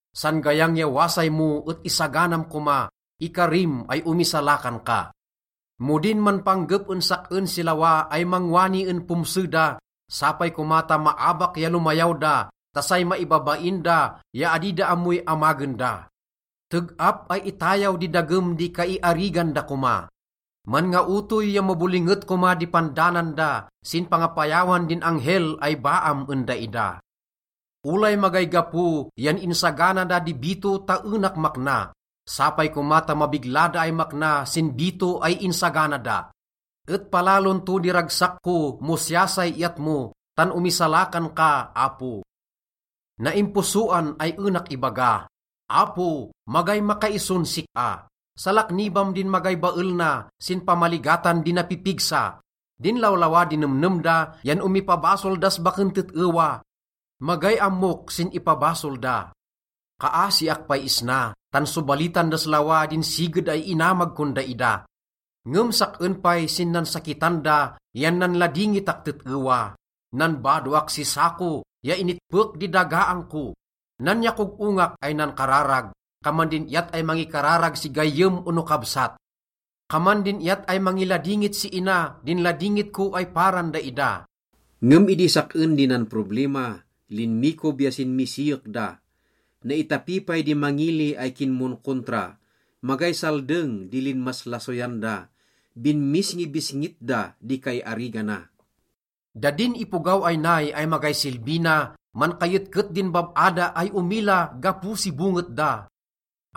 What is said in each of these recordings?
San gayang ya wasay mo et isaganam koma, ikarim ay omisalakan ka. Mo din manpanggep en sak-en si lawa ay mangwani en pomse da, sapay koma ta maabak ya lomayaw da ta say maibabain da ya adi da ammoy amagen da. Teg-ap ay itayaw di dagem di kaiarigan da koma, manngaotoy ya mabolinget koma di pandanan da sin pangapayawan din anghel ay baam en daida. Olay magay gapo yan insagana da di bito ta enak makna. Sapay koma ta mabigla da ay makna sin bito ay insagana da. Et palalon to di ragsak ko mo siya say iyat mo, tan omisalakan ka, Apo. Naimposoan ay enak ibaga, “Apo, magay makaison sik-a. Salaknibam din magay bael na sin pamaligatan di napipigsa.” Din lawlawa di nemnem da yan omipabasol das baken tet-ewa. Magay ammok sin ipabasol da. Kaasiak pay isna, tan sobalitan das lawa din siged ay inamag kon daida. Ngem sak-en pay sin nansakitan da yan nanladingitak tet-ewa. Nanbadoak si sako ya initpek di dagaang ko. Nanyakog-ongak ay nankararag, kaman din iyat ay mangikararag si gayyem ono kabsat. Kaman din iyat ay mangiladingit si ina din ladingit ko ay paran daida. Ngem idi sak-en di nanproblima, linmikob ya sinmisiyek da. Naitapi pay di mangili ay kinmonkontra, magay saldeng di linmaslasoyan da, binmisngibisngit da di kaiarigana. Da din ipogaw ay nay ay magay silbi na, mankayetket din bab-a da ay omila gapo si bonget da.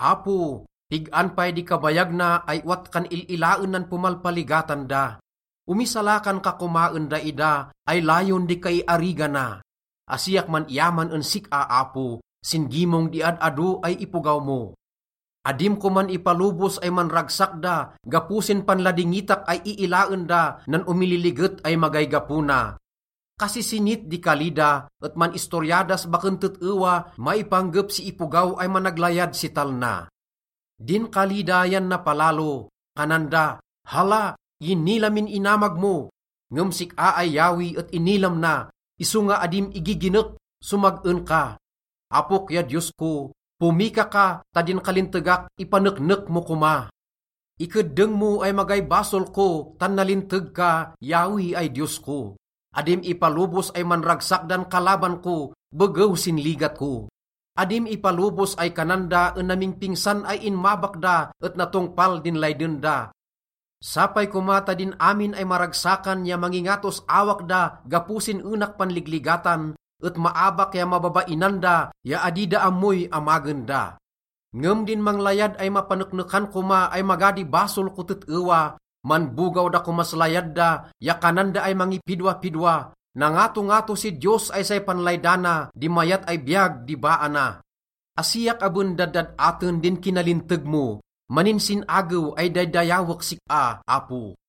Apo, pig-an pay di kabayag na ay owat kan il-ilaen nan pomalpaligatan da? Omisalakan ka koma en daida ay layon di kaiarigana. Asiak man-iyaman en sik-a, Apo, sin gimong di ad-ado ay ipogaw mo. Adim koman ipalobos ay manragsak da gapo sin panladingitak ay iilaen da nan omililiget ay magay gapo na. Kasisinit di kali da et man-istorya das baken tet-ewa maipanggep si ipogaw ay managlayad si talna. Din kali da yan napalalo. Kanan da, “Hala, inila min inamag mo.” Ngem sik-a ay Yahweh et inilam na, isonga adim igiginek, somag-en ka. Apok ya Diyos ko, pomika ka ta din kalintegak, ipaneknek mo koma. Ikeddeng mo ay magay basol ko, tan nalinteg ka, Yahweh ay Diyos ko. Adim ipalobos ay manragsak dan kalaban ko begew sin ligat ko. Adim ipalobos ay kanan da en namingpingsan ay inmabak da et natongpal din layden da. Sapay koma ta din amin ay maragsakan ya mangingatos awak da gapo sin enak panligligatan et maabak ya mababainan da ya adi da ammoy amagen da. Ngem din manglayad ay mapaneknekan koma ay maga di basol ko tet-ewa, manbogaw da komas layad da ya kanan da ay mangipidwapidwa, “Nangatongato si Diyos ay say panlaydana di mayat ay biyag di baa na.” Asiak aben daddad-aten din kinalinteg mo, maninsin-agew ay daydayawek sik-a, Apo.